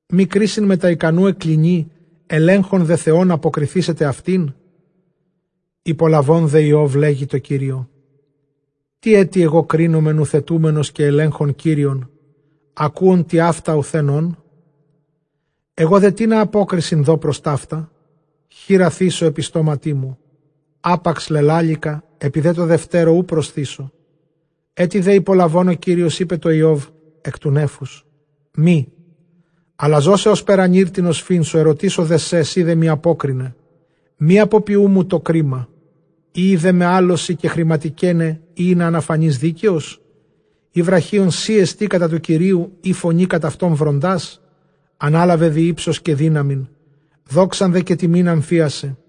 μὴ κρίσιν μετὰ ἱκανοῦ ἐκκλίνει; ἐλέγχων δὲ Θεὸν, ἀποκριθήσεται αὐτήν. Ὑπολαβὼν δὲ Ἰὼβ λέγει τῷ Κυρίῳ, τί ἔτι ἐγὼ κρίνομαι, νουθετούμενος καὶ ἐλέγχων Κύριον, ἀκούων τοιαῦτα οὐθὲν ὤν; ἐγὼ δὲ τίνα ἀπόκρισιν δῶ πρὸς ταῦτα; χεῖρα θήσω ἐπὶ στόματί μου. Ἅπαξ λελάληκα, ἐπὶ δὲ τῷ δευτέρῳ οὐ προσθήσω. Ἔτι δὲ ὑπολαβὼν ὁ Κύριος, εἶπε τῷ Ἰὼβ ἐκ τοῦ νέφους, Μὴ, ἀλλὰ ζῶσαι ὥσπερ ἀνὴρ τὴν ὀσφύν σου, ἐρωτήσω δέ σε, σὺ δέ μοι ἀπόκριναι. Μὴ ἀποποιοῦ μου τὸ κρίμα· οἴει δέ με ἄλλως σοι κεχρηματικέναι, ἢ ἳνα ἀναφανῇς δίκαιος; Ἢ βραχίων σοί ἐστι κατὰ τοῦ Κυρίου, ἢ φωνῇ κατʼ αὐτοῦ βροντᾷς; Ἀνάλαβε δὴ ὕψος καὶ δύναμιν, δόξαν δὲ καὶ τιμὴν ἀμφίασαι.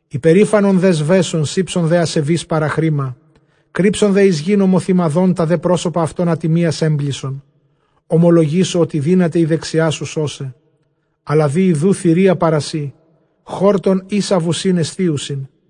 Ὑπερήφανον δὲ σβέσον, σῆψον δὲ ἀσεβεῖς παραχρῆμα. Κρύψον δὲ εἰς γῆν ὁμοθυμαδόν, τὰ δὲ πρόσωπα αὐτῶν ἀτιμίας ἔμπλησον. Ὁμολογήσω ὅτι δύναται ἡ δεξιά σου σῶσαι. Ἀλλὰ δὴ ἰδοὺ θηρία παρὰ σοὶ, χόρτον ἶσα βουσὶν ἐσθίουσιν.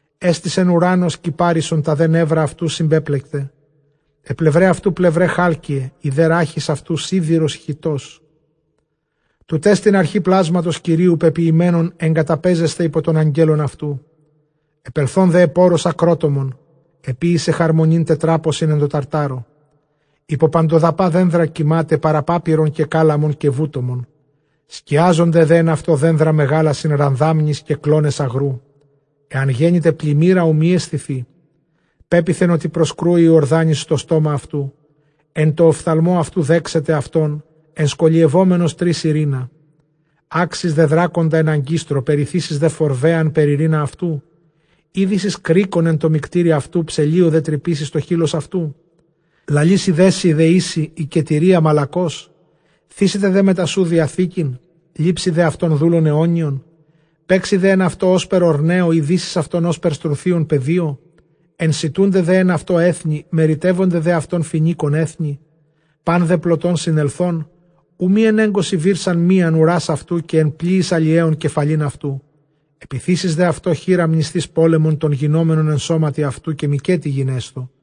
Ἔστησεν οὐρὰν ὡς κυπάρισσον, τὰ δὲ νεῦρα αὐτοῦ συμπέπλεκται. Αἱ πλευραὶ αὐτοῦ, πλευραὶ χάλκειαι, ἡ δὲ ῥάχις αὐτοῦ σίδηρος χυτός. Τουτέστιν ἀρχὴ πλάσματος Κυρίου· πεποιημένον ἐγκαταπαίζεσθαι ὑπὸ τῶν ἀγγέλων αὐτοῦ. Ἐπελθὼν δὲ ἐπʼ ὄρος ἀκρότομον, ἐποίησε χαρμονὴν τετράποσιν ἐν τῷ ταρτάρῳ. Ὑπὸ παντοδαπὰ δένδρα κοιμᾶται, παρὰ πάπυρον καὶ κάλαμον καὶ βούτομον. Σκιάζονται δὲ ἐν αὐτῷ δένδρα μεγάλα σὺν ῥαδάμνοις, καὶ κλῶνες ἀγροῦ. Ἐὰν γένηται πλημμύρα, οὐ μὴ αἰσθηθῇ· πέποιθεν, ὅτι προσκρούσει ὁ Ἰορδάνης εἰς τὸ στόμα αὐτοῦ. Ἐν τῷ ὀφθαλμῷ αὐτοῦ δέξεται αὐτόν, ἐνσκολιευόμενος τρήσει ῥῖνα. Ἄξεις δὲ δράκοντα ἐν ἀγκίστρῳ, περιθήσεις δὲ φορβαίεαν περὶ ῥῖνα αὐτοῦ; Ἤ δήσεις κρίκον ἐν τῷ μυκτῆρι αὐτοῦ, ψελλίῳ δὲ τρυπήσεις τὸ χεῖλος αὐτοῦ; Λαλήσει δέ σοι δεήσει, ἱκετηρίᾳ μαλακῶς; Θήσεται δὲ μετὰ σοῦ διαθήκην; λήψῃ δὲ αὐτὸν δοῦλον αἰώνιον; Παίξῃ δὲ ἐν αὐτῷ ὥσπερ ὀρνέῳ; ἢ δήσεις αὐτὸν ὥσπερ στρουθίον παιδίῳ; Ἐνσιτοῦνται δὲ ἐν αὐτῷ ἔθνη, μεριτεύονται δὲ αὐτὸν Φοινίκων ἔθνη; Πᾶν δὲ πλωτὸν συνελθὸν οὐ μὴ ἐνέγκωσι βύρσαν μίαν οὐρᾶς αὐτοῦ, καὶ ἐν πλοίοις ἁλιέων κεφαλὴν αὐτοῦ. Ἐπιθήσεις δὲ αὐτῷ χεῖρα, μνησθεὶς πόλεμον τὸν γινόμενον ἐν στόματι αὐτοῦ, καὶ μηκέτι γινέσθω.